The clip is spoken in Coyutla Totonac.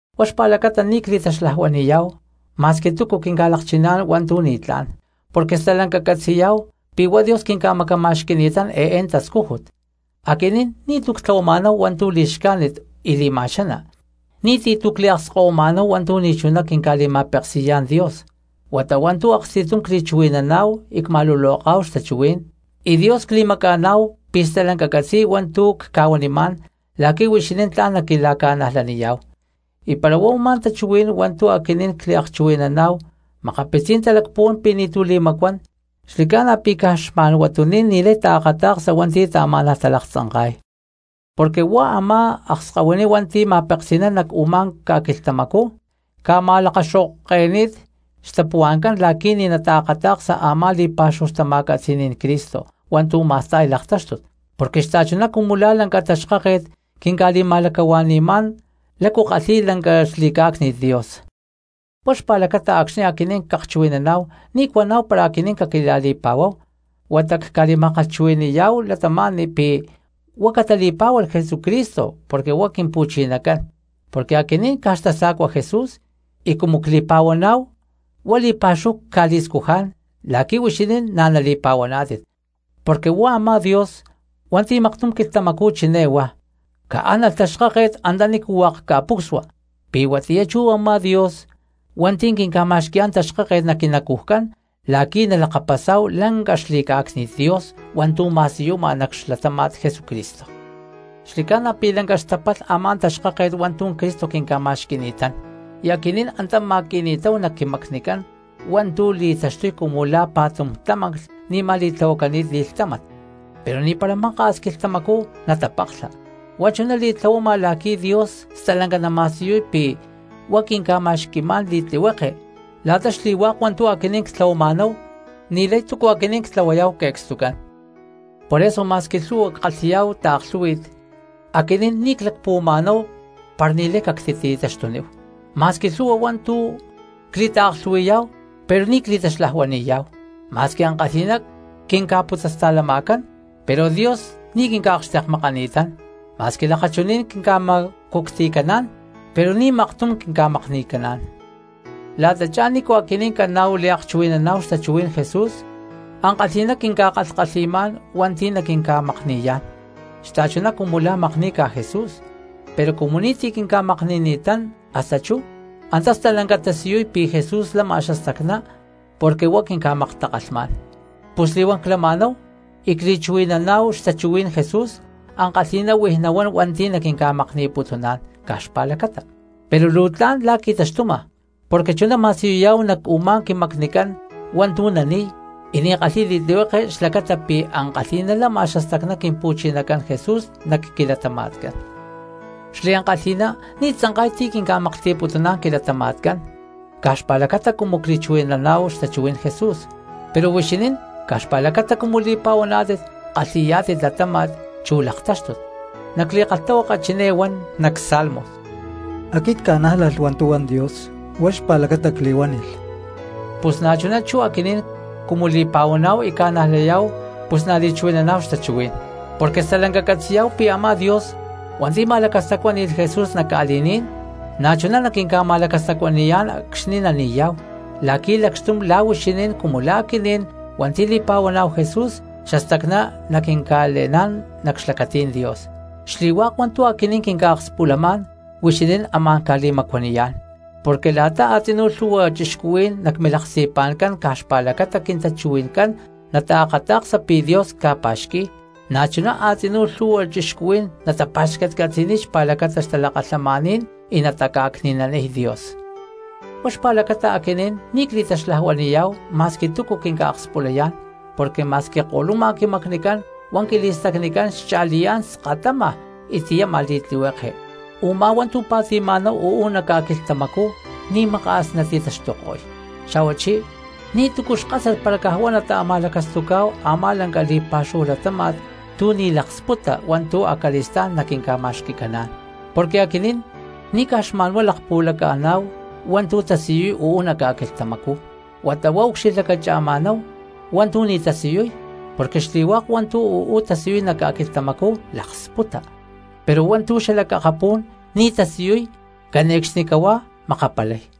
Huá xpa̠lacata ni̠ cli̠taxlajuani̠yá̠hu ma̠squi túcu quinca̠lakchiná̠n hua̠ntu̠ ni̠tlá̠n, porque stalanca ccatzi̠yá̠hu pi̠ huá Dios quinca̠macama̠xqui̠ni̠tán eé tascújut. Aquinín ni̠tu̠ ctlahuama̠náhu hua̠ntu̠ li̠xcájnit y li̠ma̠xaná; ni̠ti̠ tu̠ cliakskahuima̠náhu hua̠ntu̠ ni̠chuná quinca̠li̠ma̠peksi̠yá̠n Dios, huata hua̠ntu̠ aksti̠tum cli̠chuhui̠naná̠hu y cma̠luloká̠hu xtachuhuí̠n. Y Dios cli̠maca̠ná̠hu pi̠ stalanca catzi̠y hua̠ntu̠ cca̠huanimá̠n la̠qui̠ huixinín tla̠n naquila̠ca̠najlaniyá̠hu. Y para huá u̠má tachuhuí̠n hua̠ntu̠ aquinín cliakchuhui̠naná̠hu makapitzí̠n talacpuhuán pi̠ ni̠tu̠ li̠macuán, xli̠ca̠na pi̠ caj xma̠n huatuní̠n ni̠lay taakata̠ksa hua̠nti̠ taamá̠nalh talaktzanka̠ta̠yay. Porque huá a̠má akskahuiní hua̠nti̠ ma̠peksi̠nán nac u̠má ca̠quilhtamacú ca̠ma̠lakaxo̠ke̠ni̠t xtapuhua̠ncán la̠qui̠ ni̠ nataakata̠ksa a̠má li̠pa̠xúhu xtama̠catzi̠ní̠n Cristo hua̠ntu̠ ma̠sta̠y laktáxtut. Porque xta̠chuná cumu la̠ lanca taxkáket quinca̠li̠ma̠lacahua̠ni̠má̠n lácu kalhi̠y lanca xli̠cá̠cni̠t Dios. Huá xpa̠lacata acxni̠ aquinín cakchuhui̠naná̠hu ni̠ cuaná̠hu para aquinín caquila̠li̠pa̠huaná̠hu, huata cca̠li̠ma̠kalhchuhui̠ni̠yá̠hu cristianos pi̠ huá catali̠pá̠hualh Jesucristo porque huá Quimpu̠chinacán; porque aquinín caj xtasa̠cuá̠n Jesús y cumu cli̠pa̠huaná̠hu huá li̠pa̠xúhu cca̠li̠scujá̠n la̠qui̠ huixinín na̠ nali̠pa̠huaná̠tit. Porque huá a̠má Dios hua̠nti̠ maktum quilhtamacú chiné huá: “¡Caánalh taxkáket antanícu hua̠k ca̠pucsua!”, pi̠ huatiyá chú u̠má Dios hua̠nti̠ quinca̠ma̠xqui̠yá̠n taxkáket nac quinacujcán la̠qui̠ nalakapasá̠hu lanca xli̠cá̠cni̠t Dios hua̠ntu̠ ma̠siyuma nac xlatáma̠t Jesucristo. Xli̠ca̠na pi̠ lanca xtapalh a̠má taxkáket hua̠ntu̠ Cristo quinca̠ma̠xqui̠ni̠tán, y aquinín antá ma̠qui̠ni̠táhu nac quimacnicán hua̠ntu̠ li̠taxtuy cumu la̠ pa̠tum tlamanclh ni̠ma li̠tlahuani̠t li̠lhtámat, pero ni̠para maka̠s quilhtamacú natapaklha. Huá chuná li̠tlahuama la̠qui̠ Dios stalanca nama̠siyuy pi̠ huá quinca̠ma̠xqui̠má̠n li̠tlihueke la̠ta xli̠hua̠k hua̠ntu̠ aquinín ctlahuama̠náhu ni̠lay túcu aquinín ctlahuayá̠hu que̠cstucán. Por eso ma̠squi lhu̠hua ckalhi̠yá̠hu taaklhú̠hui̠t, aquinín ni̠ clacpuhuama̠náhu para ni̠lay cactitaxtuníhu; ma̠squi lhu̠hua hua̠ntu̠ cli̠taaklhu̠hui̠yá̠hu pero ni̠ cli̠taxlajuani̠yá̠hu. Ma̠squi ankalhi̠ná quinca̠putzasta̠lama̠cán, pero Dios ni̠ quinca̠akxtekmakani̠tán; ma̠squi lakachuní̠n quinca̠ma̠cucti̠caná̠n, pero ni̠ maktum quinca̠makni̠caná̠n. La̠tachá nícu aquinín caná̠hu liakchuhui̠naná̠hu xtachuhuí̠n Jesús, ankalhi̠ná quinca̠kalhkalhi̠má̠n hua̠nti̠ naquinca̠makni̠yá̠n xta̠chuná cumu la̠ makní̠ca Jesús, pero cumu ni̠ti̠ quinca̠makni̠ni̠tán hasta chú, antá stalanca tasiyuy pi̠ Jesús lama xastacná porque huá quinca̠maktakalhmá̠n. Pus li̠huán clama̠náhu y cli̠chuhui̠naná̠hu xtachuhuí̠n Jesús ankalhi̠ná huij nahuán hua̠nti̠ naquinca̠makni̠putuná̠n caj xpa̠lacata; pero luu tla̠n la̠ qui̠taxtuma porque chuná ma̠siyuyá̠hu nac u̠má quimacnicán hua̠ntu̠ nani̠y y ni̠ kalhi̠y li̠tlihueke xlacata pi̠ ankalhi̠ná lama xastacná Quimpu̠chinacán Jesús nac quilatama̠tcán. Xliankalhi̠ná ni̠ tzankay ti̠ quinca̠maklhti̠putuná̠n quilatama̠tcán caj xpa̠lacata cumu cli̠chuhui̠naná̠hu xtachuhuí̠n Jesús, pero huixinín caj xpa̠lacata cumu li̠pa̠huaná̠tit kalhi̠yá̠tit latáma̠t chú laktáxtut. Nac li̠kalhtahuaka chiné huan cha̠tum nac Salmos: “Aquit cca̠nájlalh hua̠ntu̠ huan Dios huá xpa̠lacata cli̠chuhuí̠nalh.” Pus na̠chuná chú aquinín cumu li̠pa̠huaná̠hu y ca̠najlayá̠hu pus na̠ li̠chuhui̠naná̠hu xtachuhuí̠n. Porque stalanca catzi̠yá̠hu pi̠ a̠má Dios hua̠nti̠ ma̠lacastacuáni̠lh Jesús nac ca̠li̠ní̠n na̠chuná naquinca̠ma̠lacastacuani̠yá̠n acxni̠ nani̠yá̠hu la̠qui̠ lacxtum la̠ huixinín cumu la̠ aquinín hua̠nti̠ li̠pa̠huaná̠hu Jesús xastacná naquinca̠le̠ná̠n nac xlacatí̠n Dios. Xli̠hua̠k hua̠ntu̠ aquinín quinca̠akspulamá̠n huixinín amá̠n ca̠li̠macuaniyá̠n, porque la̠ta a̠tzinú lhu̠hua cristianos nac milaksti̠pa̠ncán caj xpa̠lacata quintachuhui̠ncán nataakata̠ksa pi̠ Dios ca̠pa̠xqui̠y, na̠chuná a̠tzinú lhu̠hua cristianos natapa̠xcatcatzi̠niy xpa̠lacata xtalakalhamaní̠n y nataca̠cni̠naniy Dios. Huá xpa̠lacata aquinín ni̠ cli̠taxlajuani̠yá̠hu ma̠squi túcu quinca̠akspulayá̠n, porque ma̠squi ko̠luma quimacnicán, huá quili̠stacnicán xcha̠liyá̠n skatama y tiyama li̠tlihueke. Umá hua̠ntu̠ pa̠ti̠ma̠náhu uú nac ca̠quilhtamacú ni̠maka̠s nati̠taxtuko̠y; xa̠huachí ni̠tu̠cu xkásat para huá nata̠ma̠lacastucá̠hu a̠má lanca li̠pa̠xúhu latáma̠t tu̠ ni̠ laksputa hua̠ntu̠ acali̠stá̠n naquinca̠ma̠xqui̠caná̠n. Porque aquinín ni̠ caj xma̠nhuá lakpuhualaca̠ná̠hu hua̠ntu̠ tasiyuy uú nac ca̠quilhtamacú, huata huá ucxilhlacacha̠má̠náhu hua̠ntu̠ ni̠ tasiyuy; porque xli̠hua̠k hua̠ntu̠ uú tasiyuy nac ca̠quilhtamacú laksputa, pero hua̠ntu̠ xalac akapú̠n ni̠ tasiyuy cane̠cxnicahuá makapalay.